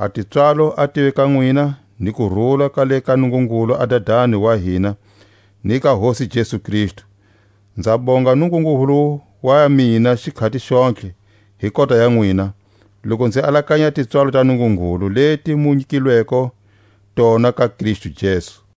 A tipswalo a tive ka nwina ni kurula ka le ka Nungungulu a Dadani wa hina, ni ka Hosi Jesu Kristu. Nza bonga Nungungulu wa mina xikhati xontlhe hi kota ya nwina, loku nzi alakanya a tipswalo ta Nungungulu leti mu nyikilweko tona ka Kristu Jesu;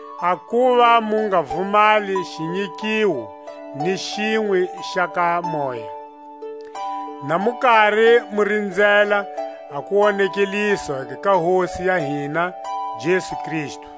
a kuva mu nga vumali xinyikiwo ni xinwe xa ka moya, na mu kari mu rinzela a kuwonekeliswa ka Hosi ya hina Jesu Kristu;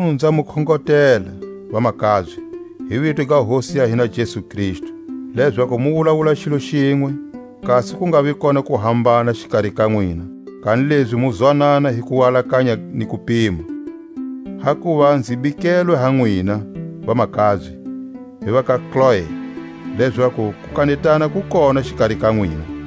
Makunu nza mu khongotela, vamakabye, hi vito ga Hosi ya hina Jesu Kristu, lezaku mu wulawula xilo xinwe, kasi ku ngavi kona kuhambana xikari ka nwina, kanilezi mu zwanana hi kualakanya ni kupima. Hakuva nzi bikelwe ha nwina, vamakabye, hi va ka Kloe, lezaku kukanetana ku kona xikari ka nwina.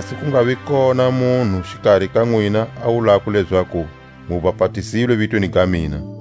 kasi ku ngavi kona munhu xikari ka nwina a wulako lezaku mu bapatizilwe vitweni ga mina.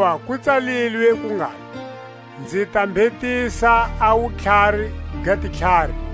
Hakuva ku tsalilwe ku ngalo: Nzi ta mbhetisa a wutlhari ga titlhari,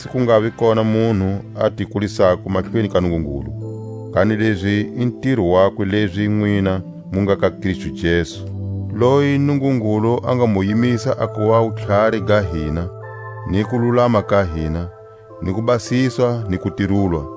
kasi ku ngavi kona munhu a ti kulisako mahlweni ka Nungungulu. Kanilezi i ntiro wakwe lezi nwina mu nga ka Kristu Jesu, loyi Nungungulu a nga mu yimisa a kuva wutlhari ga hina, ni kululama ka hina, ni kubasiswa ni kutirulwa.